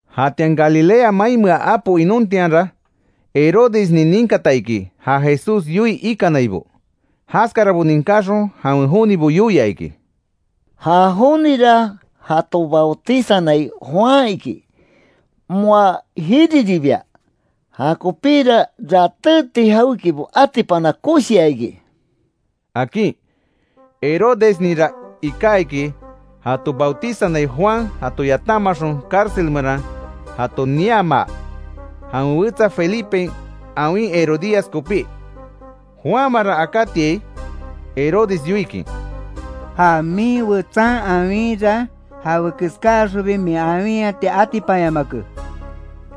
Jatian Galilea mainmea apo inontianra, Herodesnin ninkata iki ja Jesús yoii ikanaibo. Jaskarabo ninkáxon, jawen jonibo yoia iki: “Ja jonira jato bautizanai Juan iki; moa jiriribia, jakopíra, ratéti jawékibo atipana koshia iki”, akin. Herodesninra iká iki, jato bautizanai Juan jato yatamaxon, cárcel meran jato niamaa, jawen wetsa felipen awin Herodías kopí. Juanmanra akátiai Herodes yoikin: “Ja min wetsan awinra, jawekeskaxonbi min awinhati atipanyamake”,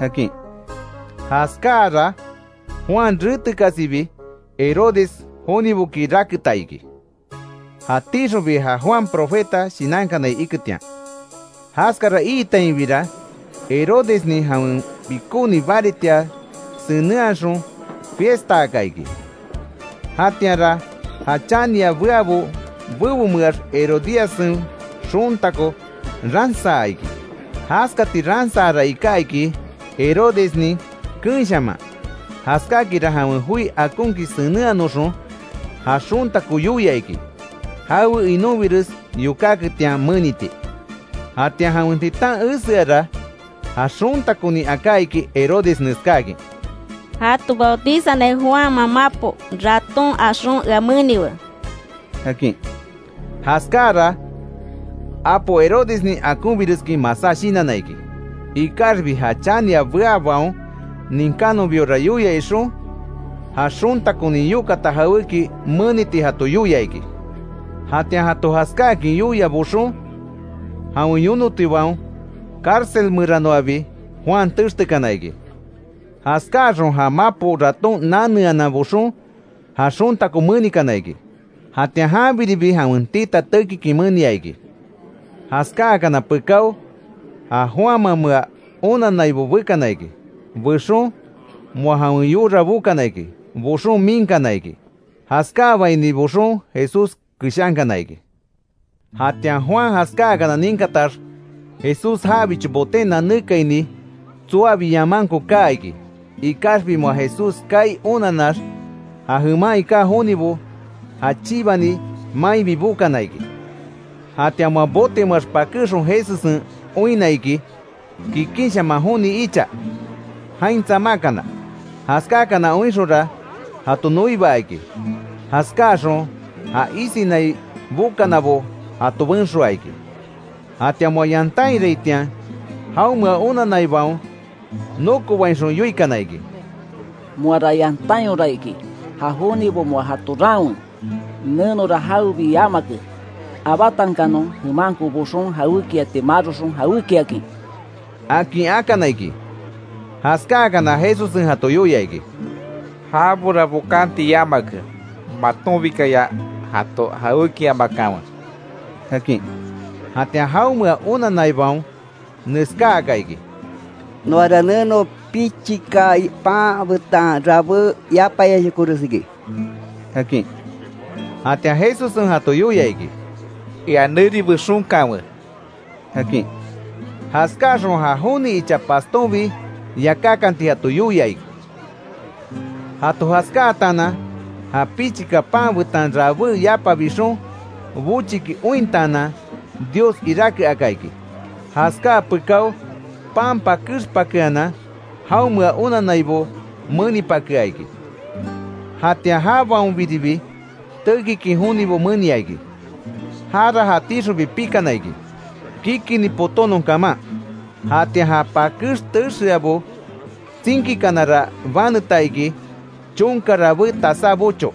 akin. Jaskáara, Juan retekasibi Herodes joniboki raketa iki, jatíxonbi ja Juan profeta shinankanai iketian. Jaskara iitainbira, Herodesnin jawen pikóni baritia senenhaxon fiestaaka iki. Jatianra ja chania beabo bebomeax, Herodíassen xontako ransaa iki. Jaskati ransaara iká iki Herodesnin keenshaman. Jaskákinra jawen joi akonkin senenhanoxon ja xontako yoia iki, jawe inonbires yokáketian meniti. Jatian jawen titan eseara, ja xontakonin aká iki Herodes neskáakin: —Jato bautizanai Juanman mapo, raton axon ea meniwe —akin. Jaskáara apo Herodesnin akonbireskin masá shinanna iki. Ikaxbi ja chania beábaon ninkánonbiora yoia ixon, ja xontakonin yokata jawéki meniti jato yoia iki. Jatian jato jaskáakin yoia boxon, jawen yonotibaon cárcel meranoabi Juan textekana iki. Jaskáaxon ja mapo raton naneanan boxon ja xontako menikana iki. Jatian janbiribi jawen tita tekikin menia iki. Jaskáakana pekáo, ja Juanmamea onannaibo bekana iki. Bexon, moa jawen yora bokana iki, boxon miinkana iki. Jaskáabaini boxon Jesús keshankana iki. Jatian Juan jaskáakana ninkatax, Jesús jabicho boten nanékaini, tsoabi yamanko kaa iki. Ikaxbi moa Jesús kaai onanax, ja jeman iká jonibo ja chibani mainbi bokana iki. Jatian moa botemeax pakéxon Jesussen oinna iki, kikinshaman joni icha jain tsamákana. Jaskákana oinxonra, jato noibaa iki. Jaskáaxon, ja isinai bokanabo jato benxoaa iki. Jatian moa yantainraitian, jaonmea onanaibaon nokobainxon yoikana iki: —Moara yantányora iki, ja jonibo moa jato raanwe, nenora jawebi yamake. Abátankanon jemanko boxon, jawékiati maroxon jawékiakin —akin akana iki. Jaskáakana Jesussen jato yoia iki: —Jabora bokanti yamake, matonbikaya jato jawékiamakanwe —akin. Jatian jaonmea onanaibaon neskáaka iki: —Noara neno pichika pan betan rabé yapayashokores iki —akin. Jatian Jesussen jato yoia iki: —Ea neri bexonkanwe —akin. Jaskáaxon ja joni icha pastonbi yakákanti jato yoia. Jato jaskáataanan, ja pichika pan betan rabé yapa bixon, bochiki ointaanan Dios iráke aka iki. Jaskáa pekáo, pan pakexpakeanan, jaonmea onannaibo menipakea iki; jatian jabaonbiribi, tekikin jonibo menia iki. Jara jatíxonbi pikana iki, kikini potónon kaman. Jatian ja pakex texeabo tsinkíkanara baneta iki, chonka rabé tasá bocho.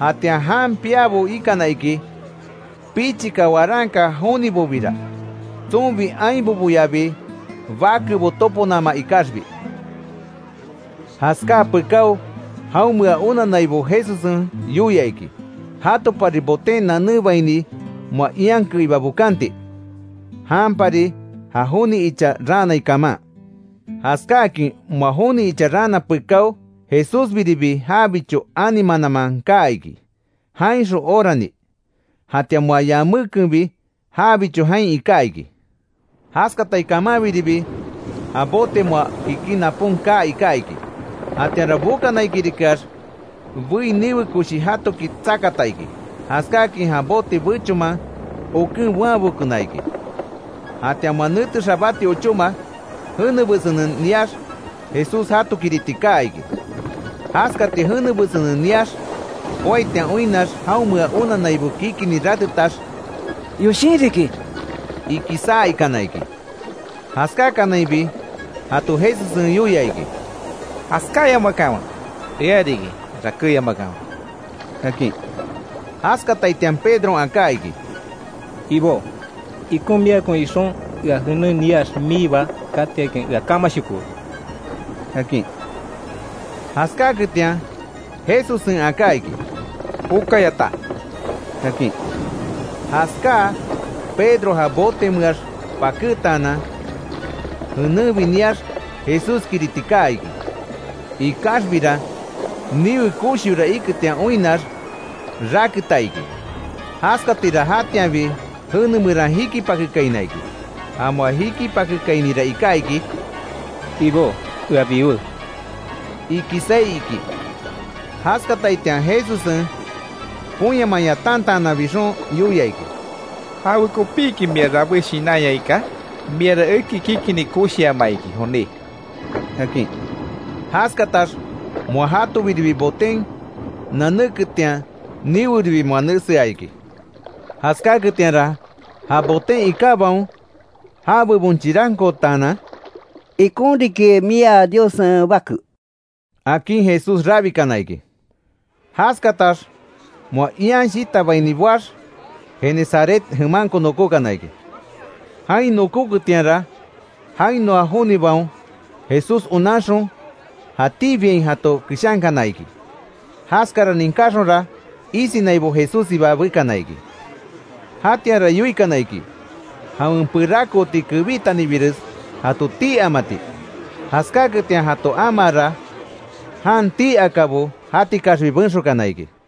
Jatian jan piábo ikana iki, pichika waranka jonibobira. Tsonbi ainboboyabi bakebo toponama ikaxbi. Jaskáa pekáo, jaonmea onannaibo Jesussen yoia iki, jatopari boten nanébaini moa ian keiba bokanti, janpari ja joni icha raanai kaman. Jaskáakin moa joni icha raana pekáo, Jesúsbiribi jabicho ani mananman kaa iki jainxon orani. Jatian moa yamékenbi jabicho jain iká iki. Jaskatai kamanbiribi ja bote moa kikin napon kaa iká iki. Jatianra bokanaikirikeax bei, niwe koshi jatoki tsakata iki, jaskákin ja bote, bechonman oken boanbekona iki. Jatian moa nete xabáti ochóma, jene besenen niax, Jesús jatokiriti kaa iki. Jaskati jene besenen niax joaitian oinnax, jaonmea onannaibo kikini ratetax: —Yoshin riki —iki saa ikana iki. Jaskákanainbi jato Jesussen yoia iki: —¡Jaskáyamakanwe! Ea riki, rakéyamakanwe —akin. Jaskataitian Pedron aká iki: —Ibó, ikon miakon ixon, ea jenen niax miiba katiakin ea kamashokowe —akin. Jaskáketian Jesussen aká iki: —Jokayata —akin. Jaskáa Pedro, ja botemeax pakétaanan, jenenbi niax Jesúskiriti kaa iki. Ikaxbira, niwe koshiora iketian oinnax, raketa iki. Jaskatira jatianbi jene meran jikipakekaina iki. Ja moa jikipakekainira iká iki: —Ibó, ea biwé —iki saí iki. Jaskataitian, Jesussen ponyaman yatantaanan bixon yoia iki: —¿Jawekopíki mia rabé shinanya iká? Miara eki kikini koshiama iki, joní —akin. Jaskatax moa jatoribi boten nanéketian, niweribi moa nesea iki. Jaskáketianra, ja botin ikábaon, já bebon chirankootanan: —Ikon riki mia Diossen Bake —akin Jesús rabikana iki. Jaskatax moa ian shitabaini boax, Genesaret jemanko nokókana iki. Jain nokóketianra, jainoa jonibaon Jesús onanxon, jatíbiain jato keshankana iki. Jaskara ninkáxonra, isinaibo Jesússiba bekana iki. Jatianra yoikana iki, jawen perakooti kebítanibires jato tii amati. Jaskáketian jato amaara, jan tii akabo jatikaxbi benxokana iki.